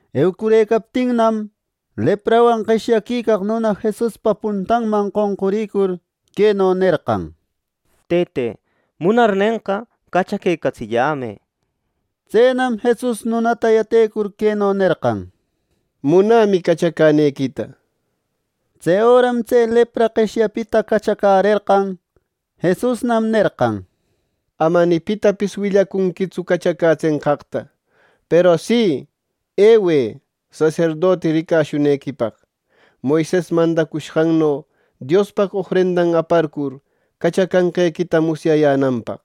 Eucurëcaptinnam, leprawan qeshyaquicaq nuna Jesuspa puntanman qonquriquicur, queno nerqan: —Tëte, munarnenqa, ¡cachaquecatsillämë! —nir. Tsenam Jesus nunata yatecur queno nerqan: —Munämi, cachacänequita —nir. Tse öram tse lepra qeshyapita cachacärerqan. Jesusnam nerqan: —Ama ni pitapis willacunquitsu cachacätsenqaqta. Peru si, ewë saserdoti ricashunequipaq, Moises mandacushqanno Diospaq ofrendan aparcur cachacashqequita musyayänanpaq.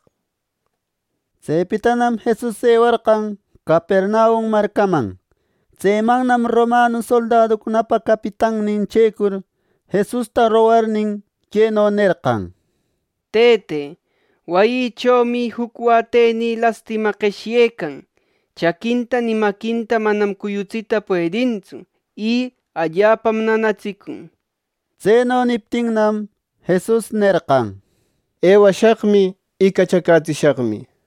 Tsepitanam Jesus ewarqan Capernaum marcaman. Tsemannam Romanu soldaducunapa capitannin checur, Jesusta rogarnin, queno nerqan: —Tëte, wayïchomi juc watenï lastima qeshyecan. Chaquinta ni maquinta manam cuyutsita puedintsu, y allapam nanatsicun —nir. Tseno niptinnam, Jesus nerqan: —Ewashaqmi, y cachacätsishaqmi —nir.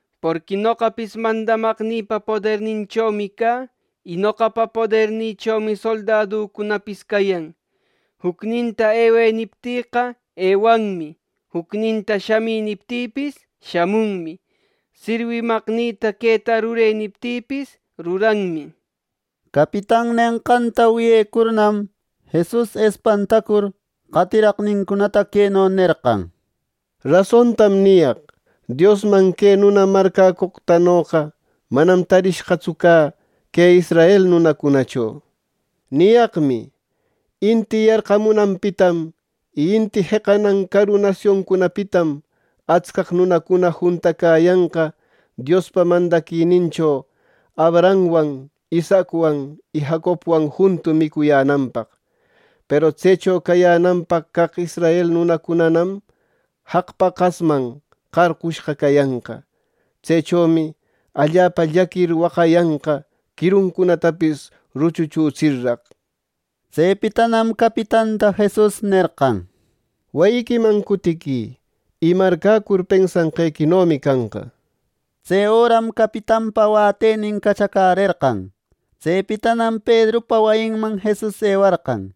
Porqui noqapis mandamaqnïpa poderninchomi cä. Y noqapa podernïchomi soldaducunapis cayan. Jucninta ‘Ewë’ niptïqa, ewanmi; jucninta ‘Shamï’ niptïpis, shamunmi; sirwimaqnïta ‘Queta rurë’ niptïpis, ruranmi —nir. Capitan nenqanta wiyecurnam, Jesus espantacur, qatiraqnincunata queno nerqan: —Rasontam niyaq: Diosman que nuna marcäcoqtanoqa manam tarishqatsu cä que israel nunacunacho. Niyaqmi: Inti yarqamunanpitam y inti jeqanan caru nasioncunapitam, atscaq nunacuna juntacäyanqa Diospa mandaquinincho Abrahamwan, Isaacwan y Jacobwan juntu micuyänanpaq. Peru tsecho cayänanpaq caq israel nunacunanam jaq paqasman qarqushqa cayanqa. Tsechomi allapa llaquir waqayanqa quiruncunatapis ruchuchutsirraq. Tsepitanam capitanta Jesus nerqan: —Wayiquiman cutiquï. Y marcäcur pensanqequinomi canqa. Tse öram capitanpa wätenin cachacärerqan. Tsepitanam Pedrupa wayinman Jesus ewarqan.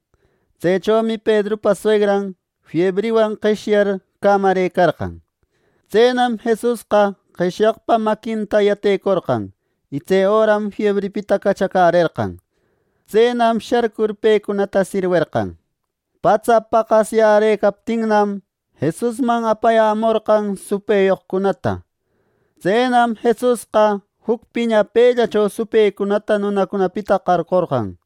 Tsechomi Pedrupa suegran fiebriwan qeshyar cämarëcarqan. Tsenam Jesusqa qeshyaqpa maquinta yatecorqan, y tse öram fiebripita cachacärerqan. Tsenam sharcur pecunata sirwerqan. Patsa paqasyärëcaptinnam, Jesusman apayämorqan supëyoqcunata. Tsenam Jesusqa juc piñapëllacho supëcunata nunacunapita qarqorqan,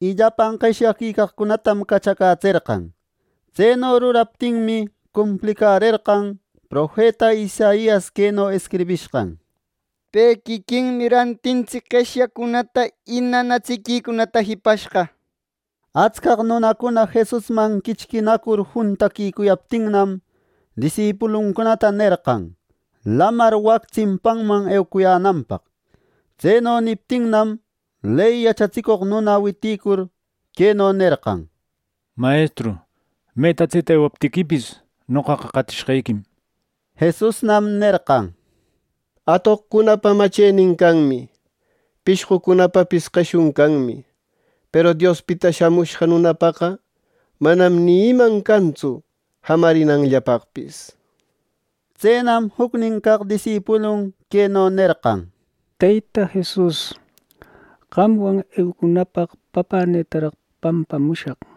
y llapan qeshyaquicaqcunatam cachacätserqan. Tseno ruraptinmi, cumplicärerqan profeta Isaias queno escribishqan: “Pe quiquinmi rantintsic qeshyacunata y nanatsiquicunata jipashqa” nir. Atscaq nunacuna Jesusman quichquinacur juntaquicuyaptinnam, disipuluncunata nerqan lamar wac tsimpanman eucuyänanpaq. Tseno niptinnam, ley yachatsicoq nuna witïcur, queno nerqan: —Mayestru, meta tseta ewaptiquipis, noqaqa qatishqequim. Jesusnam nerqan: —Atoqcunapa machenin canmi. Pishqucunapapis qeshun canmi. Peru Diospita Shamushqa Nunapaqa manam ni iman cantsu jamarinanllapaqpis. Tsenam jucnin caq disipulun queno nerqan: —Teyta Jesus, qamwan eucunäpaq papänïtaraq pampamushaq.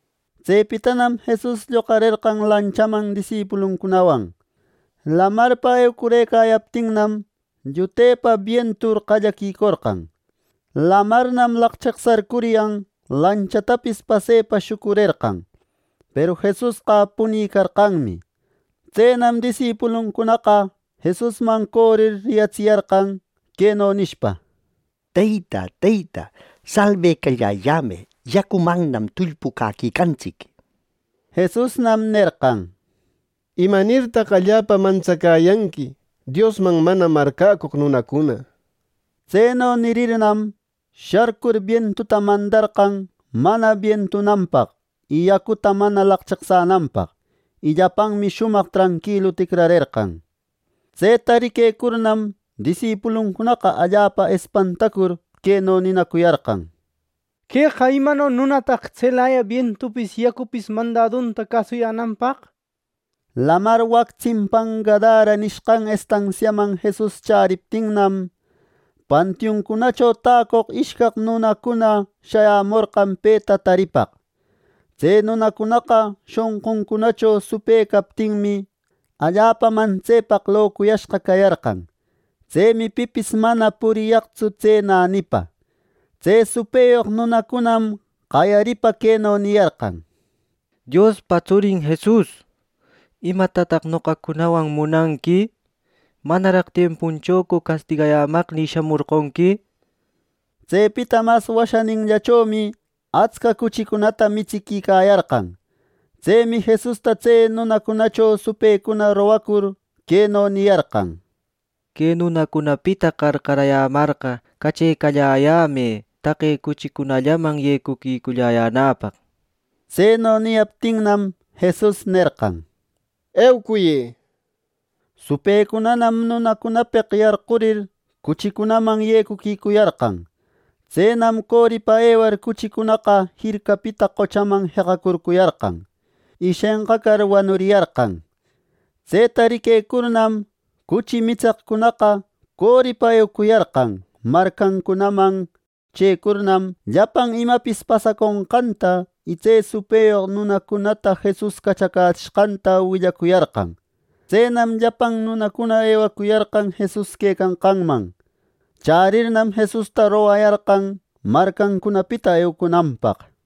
Tsepitanam Jesus lloqarerqan lanchaman disipuluncunawan. Lamarpa eucurëcayaptinnam, llutepa bientur qallaquicorqan. Lamarnam laqcheqsarcuryan lanchatapis pasepa shucurerqan; peru Jesusqa punicarqanmi. Tsenam disipuluncunaqa Jesusman corir riyatsiyarqan, queno nishpa: —¡Teyta, Teyta, salbecalläyällamë! ¡Yacumannam tullpucäquicantsic! —nir. Jesusnam nerqan: —¿Imanirtaq allapa mantsacäyanqui, Diosman mana marcäcoq nunacuna! Tseno nirirnam, sharcur bientuta mandarqan mana bientunanpaq yacuta mana laqcheqsänanpaq. Y llapanmi shumaq tranquilu ticrarerqan. Tseta riquecurnam, disipuluncunaqa allapa espantacur queno ninacuyarqan: —¡Queqa imano nunataq tselaya bientupis yacupis mandadunta cäsuyänanpaq! Lamar wac tsimpan Gadara nishqan estansiaman Jesus chäriptinnam, pantiuncunacho täcoq ishcaq nunacuna shayämorqan peta taripaq. Tse nunacunaqa shonquncunacho supë captinmi, allapa mantsepaq locuyashqa cayarqan. Tsemi pipis mana puriyaqtsu tse nänipa. Tse supëyoq nunacunanam qayaripa queno niyarqan: —Diospa tsurin Jesus, ¿Imatataq noqacunawan munanqui! ¿Manaraq tiempuchocu castigayämaqnï shamorqonqui! —nir. Tsepita mas washaninllachomi atsca cuchicunata mitsiquicayarqan. Tsemi Jesusta tse nunacunacho supëcuna rogacur queno niyarqan: —¡Que nunacunapita qarqarayämarqa, cachecalläyämë taqe cuchicunallaman yecuquiculläyänäpaq! —nir. Tseno niyaptinnam, Jesus nerqan: —¡Eucuyë! —nir. Supëcunanam, nunacunapeq yarqurir, cuchicunaman yecuquicuyarqan. Tsenam coripa ewar cuchicunaqa jircapita qochaman jeqacurcuyarqan, y shenqacar, wanuriyarqan. Tseta riquecurnam, cuchi mitseqcunaqa coripa ewacuyarqan marcancunaman. Chëcurnam, llapan imapis pasaconqanta y tse supëyoq nunacunata Jesus cachacätsishqanta willacuyarqan. Tsenam llapan nunacuna ewacuyarqan Jesus quecanqanman. Chärirnam Jesusta rogayarqan marcancunapita eucunanpaq.